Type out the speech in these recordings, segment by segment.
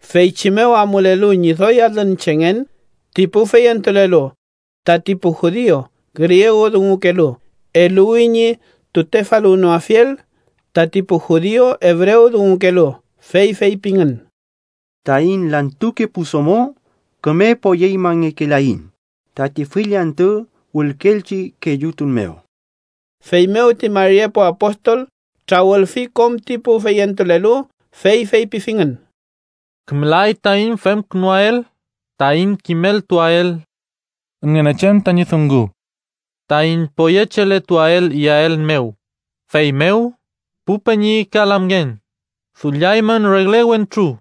Feychi mew amulelu ñi doy alün chengen ti pu feyentulelu, tati pu judiu griegudungukelu eluwi ñi tutefaluwnoafiel tati pu judiu ebrewdungukelu, fey feypingün: —Taiñ lantuke pu domo küme poyeñmangekelaiñ tati fill antü wülkeelchi kellutun mew. Feymew ti mari epu apostol trawülfi kom ti pu feyentulelu, fey feypifingün: —Kümelay taiñ femkünuael taiñ kimeltuael Ngünechen tañi dungu, taiñ poyecheletuael iyael mew. Feymew, pu peñi ka lamngen, dulliaymün regle wentru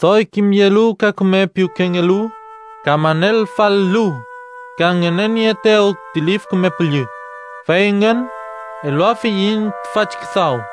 doy kimyelu ka küme piwkengelu ka manelfal-lu, ka ngünenieetew ti Lif Küme Püllü, fey engün eluafiyiñ tüfachi küdaw.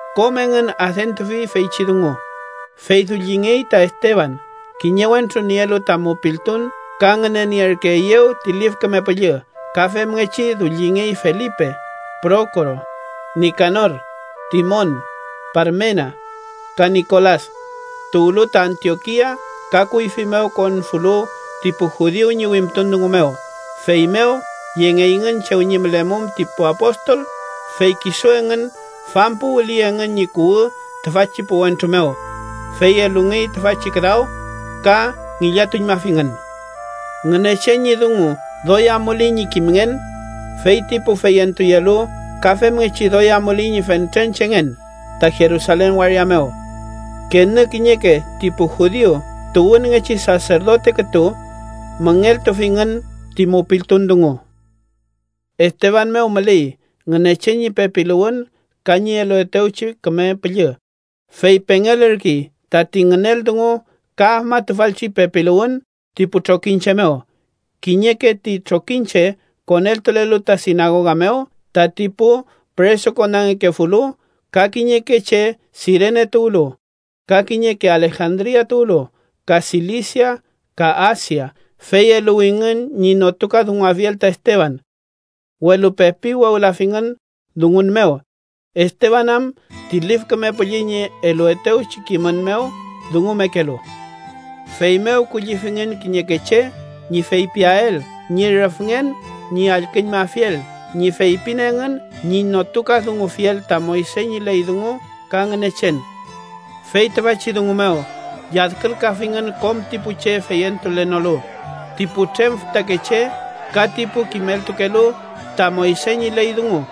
Kom engün adentufi feychi dungu, fey dullingey ta Esteban, kiñe wentru nielu ta mupiltun ka ngünenierkeeyew ti Lif Küme Püllü. Ka femngechi dullingey Felipe, Prokoro, Nikanor, Timon, Parmenas, ka Nikolas, tuwlu ta Antiokia ka kuyfi mew konfulu ti pu judiu ñi wimtun dungu mew. Feymew yengeyngün chew ñi mülemum ti pu apostol, fey kisu engün fampuwüli engün ñi kuwü tüfachi pu wentru mew, fey elungey tüfachi küdaw ka ngillatuñmafingün. Ngünechen ñi dungu doy amuley ñi kimngen, fey ti pu feyentuyelu ka femngechi doy amuley ñi fentren chengen ta Jerusalen waria mew. Kenü kiñeke ti pu judiu tuwünngechi saserdote kütu müngeltufingün ti mupiltun dungu. Esteban mew müley Ngünechen ñi pepiluwün ka ñi eluetewchi Küme Püllü, fey pengelürkey tati ngünel dungu ka afmatufalchi pepiluwün ti pu trokiñche mew. Kiñeke ti trokiñche koneltulelu ta sinagoga mew tati pu püresukonangekefulu, ka kiñeke che Sirene tuwlu, ka kiñeke Alejandria tuwlu, ka Silisia ka Asia, fey eluwingün ñi notukadunguafiel ta Esteban. Welu pepi wewlafingün dungun mew, Esteban am ti Lif Küme Püllü ñi eluetewchi kimün mew dungumekelu. Feymew kullifingün kiñeke che ñi feypiael ñi rüfngen ñi allküñmafiel ñi feypin engün ñi notukadungufiel ta Moyse ñi ley dungu ka Ngünechen. Fey tüfachi dungu mew lladkülkafingün kom ti pu che feyentulenolu, ti putrem fütakeche ka ti pu kimeltukelu ta Moyse ñi ley dungu.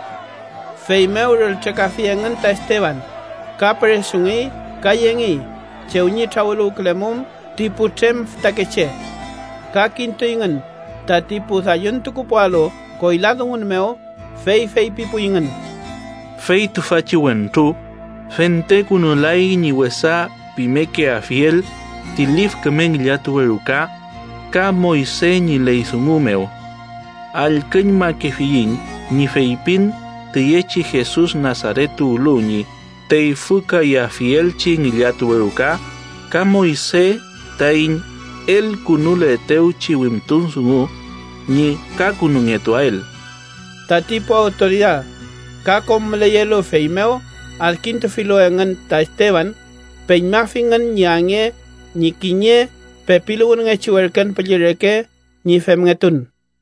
Feymew rültrekafi engün ta Esteban ka püresungey ka yengey chew ñi trawüluwkülemum ti putrem fütakeche. Ka kintuyngün tati pu dalluntukupualu koyla dungun mew, fey feypipuyngün: “Fey tüfachi wentru fentekünulay ñi wesa pimekeafiel ti lif küme ngillatuwe ruka ka Moyse ñi ley dungu mew. Allküñmakefiyiñ ñi feypin tüyechi Jesus Nasaret tuwlu ñi teyfükayafielchi ngillatuwe ruka ka Moyse taiñ elkünuletewchi wimtun dungu ñi kakünungetuael.” Tati pu awtoridad ka kom müleyelu fey mew adkintufilu engün ta Esteban, peñmafingün ñi ange ñi kiñe pepiluwünngechi werken püllü reke ñi femngetun.